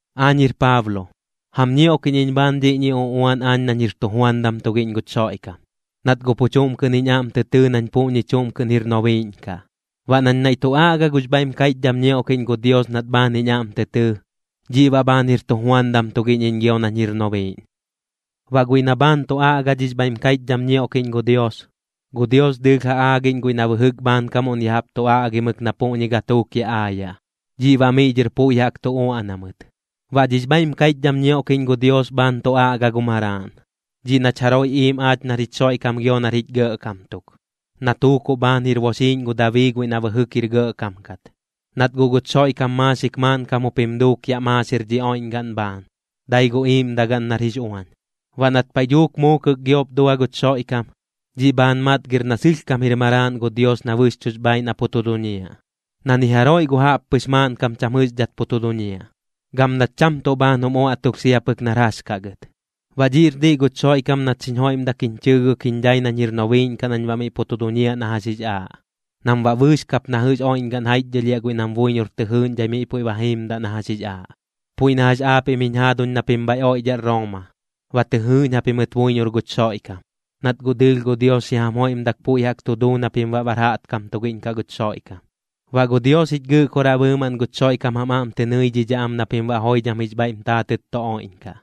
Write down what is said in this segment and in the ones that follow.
Aañ jir Paablo, jam ñioꞌkiꞌñ iñ bhaan dhiꞌñi uꞌuan aañ nañ jir tujuandam tugiꞌñ guch Xoiꞌkam, nat guꞌ pu chuꞌm kɨꞌn jiñ aꞌm tɨ tɨɨ nañ puꞌñi chuꞌm kɨꞌn jir nobiiꞌñ kaꞌ. Baꞌ nañ naiꞌ tu aꞌga gux bhaiꞌm kaiꞌchdham ñioꞌkiꞌñ gu Dios nat bhaan jiñ aꞌm tɨ tɨɨ, dhiꞌ baꞌ bhaan jir tujuandam tugiꞌñ iñ gio nañ jir nobiiꞌñ. Baꞌ guiꞌ na bhaan tu aꞌga dhix bhaiꞌm kaiꞌchdham ñioꞌkiꞌñ gu Dios, gu Dios dɨɨlh ja aaꞌñ guiꞌ na bɨjɨk bhaankamuꞌn ya jaꞌp tu aꞌgimɨk na puꞌñi gatuuk yaꞌ aayaꞌ, dhiꞌ baꞌ miꞌ dhɨr puiꞌ jaꞌk tu uaꞌna mɨt. Baꞌ dhix bhaiꞌm kaiꞌchdham ñioꞌkiꞌñ gu Dios bhaan tu aꞌga gu Maraaꞌn, dhiꞌ nach jaroiꞌ iim aach nar jich Xoiꞌkam gio nar jich Gɇꞌkam tuk, na tuukuꞌ bhaan jir boxiiꞌñ gu Dabii guiꞌ na bɨjɨk jir gɇꞌkam kat. Nat guꞌ guch Xoiꞌkam maaxik maaꞌnkam jup jim duuk yaꞌ maaxir dhi oiꞌñgaꞌn bhaan, dai gu iiꞌmdagaꞌn nar jix uañ. Baꞌ nat paiꞌ dhuuk muukɨk giop dua guch Xoiꞌkam, dhiꞌ bhaan matgir na sɨlhkam jir Maraaꞌn gu Dios na bɨxchuꞌx bhaaiꞌ na pu tu duñiaꞌ, na ni jaroiꞌ gu jaꞌppɨx maaꞌnkam cham jɨꞌxdhat pu tu duñiaꞌ, gam nat cham tuꞌ bhaan jum uaꞌtulh sia pɨk nar jax kaꞌ gɨt. Baꞌ dhiꞌr diꞌ guch Xoiꞌkam nat xiñ joiꞌmdak jiñ chɨɨgɨk jiñ dhai nañ jir nobiiꞌñ kaꞌ nañ baꞌ miꞌ pu tu duñiaꞌ na jax jix aaꞌ, nam baꞌ bɨɨx kap na jɨꞌx oiꞌñgaꞌn jaiꞌchdhɨlhiaꞌ guiꞌ nam buiñor tɨ jɨɨꞌñdhai miꞌ puiꞌ ba jiimdaꞌ na jax jix aaꞌ. Puiꞌ na jax aapiꞌm jiñ jaaduñ na pim bhaiꞌ oidhaꞌ Rooma, ba tɨ jɨɨꞌñ japimɨt buiñor guch Xoiꞌkam, nat guꞌ dɨɨlh gu Dios xi jam joiꞌmdak puiꞌ jaꞌk tu duu na pim baꞌ bar jaꞌtkam tugiꞌñ kaꞌ guch Xoiꞌkam. Baꞌ gu Dios jich Gɨꞌkoraꞌ bɨɨmaꞌn guch Xoiꞌkam jam aꞌm tɨ nɨidhidhaꞌ am na pim baꞌ joidham jix bhaiꞌm taatɨt tu oiꞌñkaꞌ.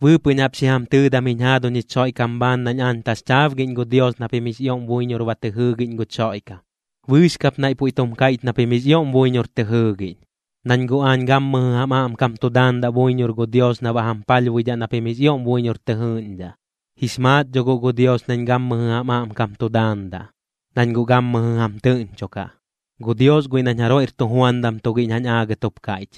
Bɨɨpɨꞌñ jaꞌp xi jam tɨɨdam jiñ jaaduñ jich Xoiꞌkam bhaan nañ aañ taxchaabgiꞌñ gu Dios na pim jix ioꞌm buiñor ba tɨ jɨɨgiꞌñ guch Xoiꞌkam, bɨɨx kap naiꞌ puiꞌ tum kaiꞌch na pim jix ioꞌm buiñor tɨ jɨɨgiꞌñ. Nañ guꞌ aañ gammɨjɨ jam aꞌmkam tu daandaꞌ buiñor gu Dios na baꞌ jam palhbuidhaꞌ na pim jix ioꞌm buiñor tɨ jɨɨꞌñdhaꞌ. Jix maat dho guꞌ gu Dios nañ gammɨjɨ jam aꞌmkam tu daandaꞌ, nañ guꞌ gammɨjɨ jam tɨꞌñchokaꞌ. Gu Dios guiꞌ nañ jaroiꞌr tujuandam tugiꞌñ jañ aagɨt jup kaiꞌch,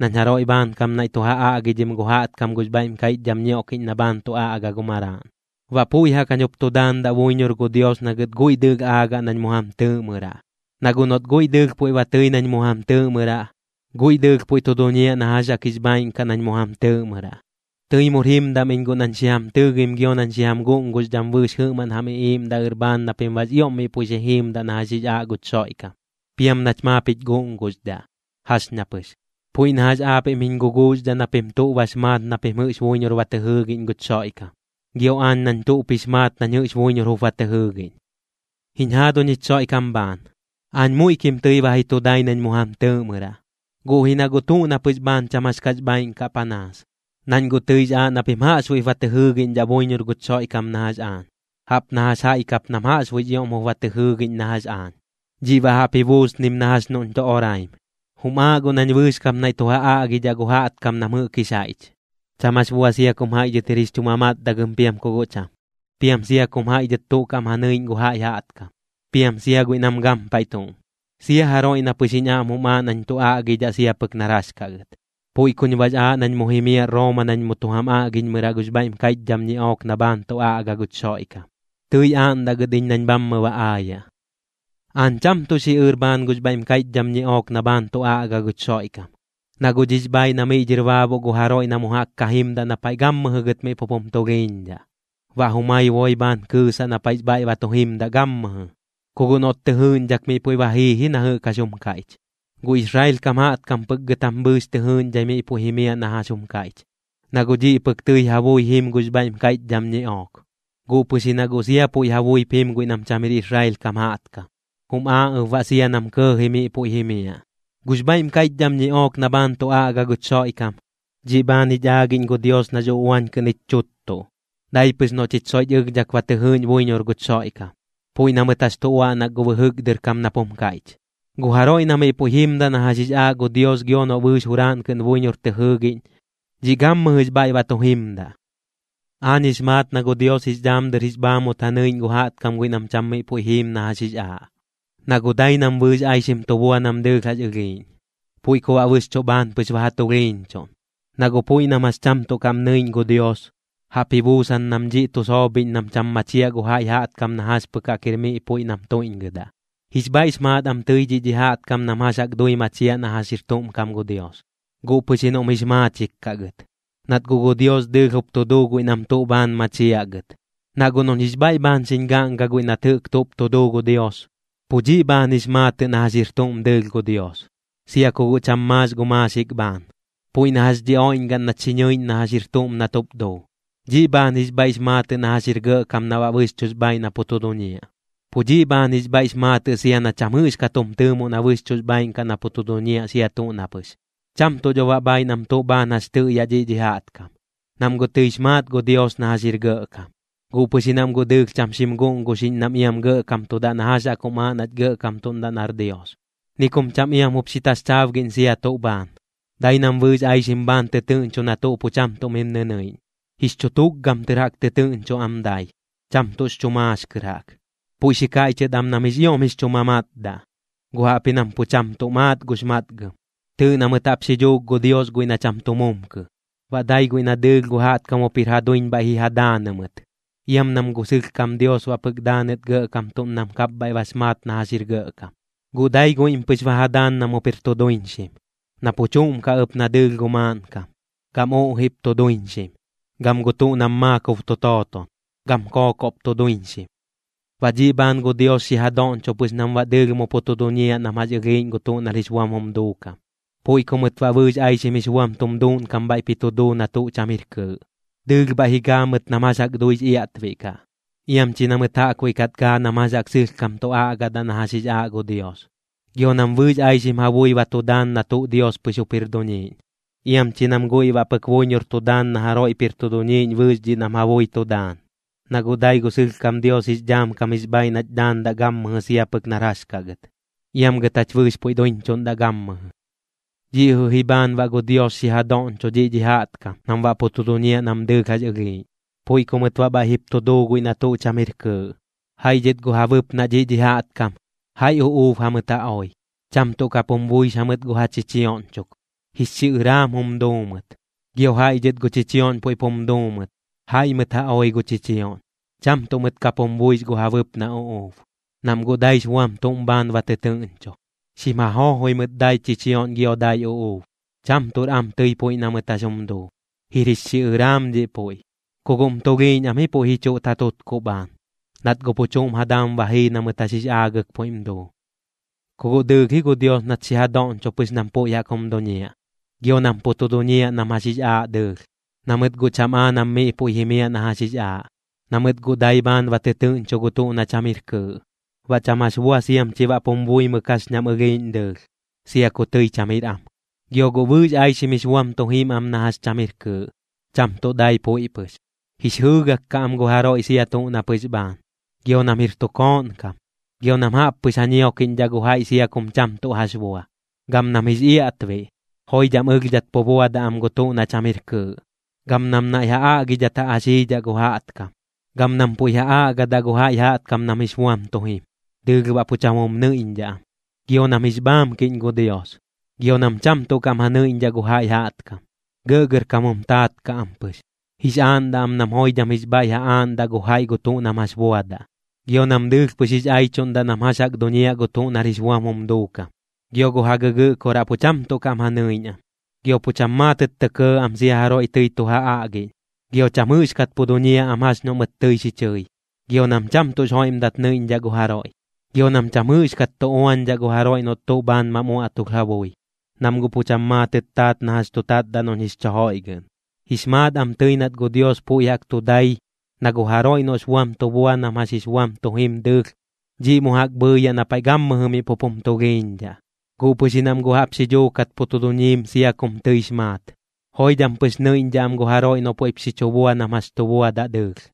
nañ jaroiꞌ bhaankam naiꞌ tu ja aꞌgidhim gu jaꞌtkam gux bhaiꞌm kaiꞌchdham ñioꞌkiꞌñ na bhaan tu aꞌga gu Maraaꞌn. Baꞌ puiꞌ jaꞌk jañ jup tu daandaꞌ buiñor gu Dios na gɨt guiꞌ dɨɨlh aagaꞌ nañ mu jam tɨɨꞌmɨraꞌ, na guꞌ noꞌt guiꞌ dɨɨlh puiꞌ ba tɨi nañ mu jam tɨɨꞌmɨraꞌ, guiꞌ dɨɨlh puiꞌ tu duñiaꞌ na jax jaꞌk jix bhaaiꞌn kaꞌ nañ mu jam tɨɨꞌmɨraꞌ. Tɨi mur jimdam iñ guꞌ nañ xi jam tɨɨgim gio nañ xi jam guꞌnguxdham bɨɨx jɨꞌmaꞌn jam iꞌiiꞌmdaꞌɨr bhaan na pim baꞌx ioꞌm miꞌ puiꞌ xi jiimdaꞌ na jax jix aaꞌ guch Xoiꞌkam. Piam nach maap jich guꞌnguxdhaꞌ, jax ña pɨx. Puiꞌ na jax aapiꞌm jiñ guguuxdhaꞌ na pim tuꞌ bax maat na pim jɨꞌx buiñor ba tɨ jɨɨgiꞌñ guch Xoiꞌkam, gio aañ nañ tuꞌp jix maat nañ jɨꞌx buiñor jup ba tɨ jɨɨgiꞌñ. Jiñ jaaduñ jich Xoiꞌkam bhaan, aañ muiꞌkim tɨi ba ji tu dai nañ mu jam tɨɨꞌmɨraꞌ, guꞌ ji na guꞌ tuꞌ na pɨx bhaan cham jax kax bhaaiꞌn kaꞌ panaas. Nañ guꞌ tɨix aaꞌ na pim jaꞌxbuiꞌp ba tɨ jɨɨgiꞌñdhaꞌ buiñor guch Xoiꞌkam na jax aañ, jaꞌp na jax jaiꞌ kap nam jaꞌxbuiꞌx ioꞌm jup ba tɨ jɨɨgiꞌñ na jax aañ. Dhiꞌ baꞌ jaꞌp ji buusnim na jax noꞌñ tu oraim. Jum aaꞌ guꞌ nañ bɨɨx kap naiꞌ tu ja aꞌgidhaꞌ gu jaꞌtkam nam jɨꞌk jix jaiꞌch, cham jax bua sia kum jaiꞌ dhɨt jir jix chu mamatdagɨm piam ku guꞌ cham, piam sia kum jaiꞌ dhɨt tuꞌ kaꞌm ja nɨiꞌñ gu jaiꞌ jaꞌtkam, piam sia guiꞌ nam gampaiꞌ tuꞌm, sia jaroiꞌ na pɨx jiñ aꞌm jum aaꞌ nañ tu aꞌgidhaꞌ sia pɨk nar jax kaꞌ gɨt. Puiꞌ kuñ baꞌx aaꞌ nañ mu jimiaꞌ Rooma nañ mu tu jam aꞌgiꞌñmɨraꞌ gux bhaiꞌm kaiꞌchdham ñiꞌook na bhaan tu aꞌga guch Xoiꞌkam, tɨi aaꞌndaꞌ gɨt iñ nañ bhammɨ ba aayaꞌ. Aañ cham tuꞌ xiꞌɨr bhaan gux bhaiꞌm kaiꞌchdham ñiꞌook na bhaan tu aꞌga guch Xoiꞌkam, na guꞌ dhiꞌx bhaaiꞌ na miꞌ dhɨr baabuꞌ gu jaroiꞌ na mu jaꞌk ka jimdaꞌ na paiꞌ gammɨjɨ gɨt miꞌ pup jum tulhiiñdhaꞌ, baꞌ jumai boi bhaan kɨɨsaꞌ na paiꞌx bhaiꞌ ba tu jimdaꞌ gammɨjɨ, ku guꞌ noꞌt tɨ jɨɨꞌñdhak miꞌ puiꞌ ba jii ji na jɨꞌk jax jum kaiꞌch. Gu Israel kam jaꞌtkam pɨk gɨt jam bɨɨx tɨ jɨɨꞌñdhai miꞌ puiꞌ jimiaꞌ na jax jum kaiꞌch, na guꞌ dhiꞌ pɨk tɨi ja bui jim gux bhaiꞌm kaiꞌchdham ñiꞌook. Guꞌ pɨx ji na guꞌ sia puiꞌ ja buip jim guiꞌ nam cham jir Israel kam jaꞌtkam, jum aaꞌ ɨp baꞌ sia nam kɇɇji miꞌ puiꞌ jimiaꞌ. Gux bhaiꞌm kaiꞌchdham ñiꞌook na bhaan tu aꞌga guch Xoiꞌkam, dhiꞌ bhaan jich aagiꞌñ gu Dios nax uꞌuañ kɨꞌn jich chuttuꞌ, dai pɨx noꞌ chich soiꞌch ɨlhdhak ba tɨ jɨɨꞌñ buiñor guch Xoiꞌkam, puiꞌ na mɨt jax tu uaꞌnak gu bɨjɨk dɨr kam nap jum kaiꞌch: “Gu jaroiꞌ na miꞌ puiꞌ jimdaꞌ na jax jix aaꞌ gu Dios gio noꞌ bɨɨx juraaꞌn kɨꞌn buiñor tɨ jɨɨgiꞌñ, dhiꞌ gammɨjɨx bhaiꞌ ba tu jimdaꞌ.” Aañ jix maat na gu Dios jix dhaam dɨr jix bhaamut ja nɨiꞌñ gu jaꞌtkam guiꞌ nam cham miꞌ puiꞌ jiim na jax jix aaꞌ, na guꞌ dai nam bɨɨx aixim tu bua nam dɨɨlh jax ɨlhiiꞌñ, puiꞌ ku baꞌ bɨxchuꞌ bhaan pɨx ba ja tulhiiñchuꞌn. Na guꞌ puiꞌ nam jax cham tuꞌ kaꞌm nɨiꞌñ gu Dios, jaꞌp ji buusan nam dhiꞌ tu soobhiꞌñ nam cham machiaꞌ gu jaiꞌ jaꞌtkam na jax pɨk jaꞌk jir miꞌ puiꞌ nam tuiꞌñgɨdaꞌ. Jix bhaiꞌx maat am tɨi dhiꞌ dhi jaꞌtkam nam jax jaꞌk dui machiaꞌ na jax jir tuꞌm kam gu Dios, guꞌ pɨx ji noꞌm jix maachik kaꞌ gɨt. Nat guꞌ gu Dios dɨɨlh jup tu duu guiꞌ nam tuꞌ bhaan machiaꞌ gɨt. Na guꞌ noꞌñ jix bhaiꞌ bhaan xiñ gaꞌnga guiꞌ nat jɨꞌk tuꞌp tu duu gu Dios, pu dhiꞌ bhaan jix maatɨꞌ na jax jir tuꞌm dɨɨlh gu Dios, sia ku guꞌ cham maax gu maaxik bhaan. Puiꞌ na jax dhi oiꞌñgaꞌn nach xi ñɨiꞌñ na jax jir tuꞌm nat jup duu, dhiꞌ bhaan jix bhaiꞌx maatɨꞌ na jax jir gɇꞌkam na baꞌ bɨxchuꞌx bhaaiꞌ na pu tu duñiaꞌ. Pu dhiꞌ bhaan jix bhaiꞌx maatɨꞌ sia na cham jɨꞌxkat jum tɨɨmoꞌ na bɨxchuꞌx bhaaiꞌn kaꞌ na pu tu duñiaꞌ sia tuꞌ na pɨx. Cham tuꞌ dho baꞌ bhaaiꞌ nam tuꞌ bhaan jax tɨꞌyaꞌ dhiꞌ dhi jaꞌtkam, nam guꞌ tɨix maat gu Dios na jax jir gɇꞌkam, guꞌ pɨx ji nam guꞌ dɨɨlh cham xim guꞌnguxiꞌñ nam iam gɇꞌkamtudaꞌ na jax jaꞌk jum aaꞌ nach gɇꞌkamtuꞌndaꞌ nar Dios. Ni kum cham iam jup xi taxchaabgiꞌñ sia tuꞌ bhaan, dai nam bɨɨx aixim bhaan tɨtɨɨꞌñcho na tuꞌ pu cham tuꞌ mim nɨnɨiꞌñ. Jix chu tukgam tɨr jaꞌk tɨtɨɨꞌñcho am dai, cham tuꞌx chu maax kɨr jaꞌk. Puiꞌ xi kaiꞌchɨt am nam jix ioꞌm jix chu mamatdaꞌ, guꞌ jaꞌpji nam pu cham tuꞌ maat gux matgɨm. Tɨɨꞌ na mɨt jaꞌp xi dhuuk gu Dios guiꞌ na cham tu mumkɨ, baꞌ dai guiꞌ na dɨɨlh gu jaꞌtkam jup jir ja duiñ bhaiꞌ ji ja daanɨ mɨt. Iam nam gu sɨlhkam Dios baꞌ pɨk daanɨt gɇꞌkamtuꞌn nam kapbhaiꞌ bax maat na jax jir gɇꞌkam. Guꞌ dai guiꞌm pɨx ba ja daan nam jup jir tu duiñxim, na pu chuꞌm kaꞌ ɨp na dɨɨlh gu maaꞌnkam, gam uꞌjiꞌp tu duiñxim, gam gu tuꞌ nam maakob tu tooton, gam kookoꞌp tu duiñxim. Baꞌ dhiꞌ bhaan gu Dios xi ja doꞌñcho pɨx nam baꞌ dɨɨlh mu pu tu duñiaꞌ nam jax ɨlhiiꞌñ gu tuꞌ nar jix buam jum duukam, puiꞌ ku mɨt baꞌ bɨɨx aixim jix buam tum duuꞌnkam bhaiꞌp jip tu duu na tuꞌ cham jir kɨɨꞌ. Dɨɨlh bhaiꞌ ji gaa mɨt nam jax jaꞌk duix iaꞌtbiꞌ kaꞌ, iam chi na mɨt jaꞌkbuiꞌ kat gaa nam jax jaꞌk sɨlhkam tu aꞌgadaꞌ na jax jix aaꞌ gu Dios. Gio nam bɨɨx aixim ja bui ba tu daan na tuꞌ Dios pɨx jup jir duñiiꞌñ, iam chi nam guiꞌ baꞌ pɨk buiñor tu daan na jaroiꞌp jir tu duñiiꞌñ bɨɨx dhiꞌ nam ja bui tu daan. Na guꞌ dai gu sɨlhkam Dios jix dhaam kam jix bhaaiꞌ nach dhaandaꞌ gammɨjɨ sia pɨk nar jax kaꞌ gɨt. Iam gɨt jach bɨɨx puiꞌ duiñchuꞌndaꞌ gammɨjɨ. Dhiꞌ jɨꞌ ji bhaan baꞌ gu Dios xi ja doꞌñcho dhiꞌ dhi jaꞌtkam nam baꞌ pu tu duñiaꞌ nam dɨɨlh jax ɨlhiiꞌñ, puiꞌ ku mɨt baꞌ bhaiꞌ jip tu duu guiꞌ na tuꞌ cham jir kɨɨꞌ. Jaiꞌ dhɨt gu ja bɨpnaꞌ dhiꞌ dhi jaꞌtkam, jaiꞌ uꞌuub jamɨt ja oi, cham tuꞌ kap jum buix jamɨt gu ja chichioꞌñ chuk, jix xiꞌɨraam jum duu mɨt. Gio jaiꞌ dhɨt gu chichioꞌñ puiꞌp jum duu mɨt, jaiꞌ mɨt ja oi gu chichioꞌñ, cham tuꞌ mɨt kap jum buix gu ja bɨpnaꞌ uꞌuub, nam guꞌ daix buam tuꞌm bhaan ba tɨtɨɨꞌñcho. Xim ja joojoi mɨt dai chichioꞌñ gio dai uꞌuub, cham tuꞌr am tɨi puiꞌ na mɨt jax jum duu, jir jix xiꞌɨraam dhiꞌ puiꞌ. Ku guꞌm tulhiiñ am ji puiꞌ ji chuꞌt ja tutkuꞌ bhaan, nat guꞌ pu chuꞌm ja daam ba jii na mɨt jax jix aagɨk puiꞌm duu. Ku guꞌ dɨɨlh ji gu Dios nat xi ja doꞌñcho pɨx nam puiꞌ jaꞌk jum duñiaꞌ, gio nam pu tu duñiaꞌ nam jax jix aaꞌ dɨɨlh, na mɨt guꞌ cham aa nam miꞌ puiꞌ jimiaꞌ na jax jix aaꞌ, na mɨt guꞌ dai bhaan ba tɨtɨɨꞌñcho gu tuꞌ na cham jir kɨɨꞌ. Baꞌ cham jax bua siam chi baꞌ pum buimɨk jax ñam ɨlhiiꞌñ dɨɨlh, sia ku tɨi cham jir am. Gio guꞌ bɨɨx aixim jix buam tu jim am na jax cham jir kɨɨꞌ, cham tuꞌ dai puiꞌ pɨx. Jix jɨɨgak kaꞌ am gu jaroiꞌ sia tuꞌ na pɨx bhaan. Gio nam jir tu kooꞌn kam. Gio nam jaꞌp pɨx ja ñiokiꞌñdhaꞌ gu jaiꞌ sia kum cham tuꞌ jax bua. Gam nam jix iaꞌtbiꞌ. Joidham ɨlhdhat pu buadaꞌ am gu tuꞌ na cham jir kɨɨꞌ, gam nam naiꞌ ja aꞌgidhat ja axiidhaꞌ gu jaꞌtkam. Gam nam puiꞌ ja aꞌgadaꞌ gu jaiꞌ jaꞌtkam nam jix buam tu jim, dɨɨlh baꞌ pu cham jum nɨiꞌñdhaꞌ am. Gio nam jix bhaamkiꞌñ gu Dios. Gio nam cham tuꞌ kaꞌm ja nɨiꞌñdhaꞌ gu jaiꞌ jaꞌtkam, gɇꞌgɇrkam jum taat kaꞌ am pɨx, jix aaꞌndaꞌ am nam joidham jix bhaiꞌ ja aaꞌndaꞌ gu jaiꞌ gu tuꞌ nam jax buadaꞌ. Gio nam dɨɨlh pɨx jix aichuꞌndaꞌ nam jax jaꞌk duñiaꞌ gu tuꞌ nar jix buam jum duukam. Gio gu ja gɨgɨꞌkoraꞌ pu cham tuꞌ kaꞌm ja nɨiꞌñ am. Gio pu cham maatɨt tɇ kɇɇ am sia jaroiꞌ tɨi tu ja aꞌgiꞌñ. Gio cham jɨꞌxkat pu duñiaꞌ am jax noꞌ mɨt tɨi xi chɨi. Gio nam cham tuꞌx joiꞌmdat nɨiꞌñdhaꞌ gu jaroiꞌ. Gio nam cham jɨꞌxkat tu uañdhaꞌ gu jaroiꞌ noꞌt tuꞌ bhaan mam uaꞌtulh ja bui, nam guꞌ pu cham maatɨt taat na jax tu tatdaꞌ noꞌñ jix chu joiꞌgɨꞌn. Jix maat am tɨi nat gu Dios puiꞌ jaꞌk tu dai, na gu jaroiꞌ noꞌx buam tu bua nam jax jix buam tu jim dɨɨlh, dhiꞌ mu jaꞌk bhɨɨyaꞌ na paiꞌ gammɨjɨ miꞌ pup jum tulhiiñdhaꞌ, guꞌ pɨx ji nam guꞌ jaꞌp xi dhuukat pu tu duñiim sia kum tɨix maat. Joidham pɨx nɨiꞌñdhaꞌ am gu jaroiꞌ noꞌ puiꞌp xi chu bua nam jax tu buadaꞌ dɨɨlh.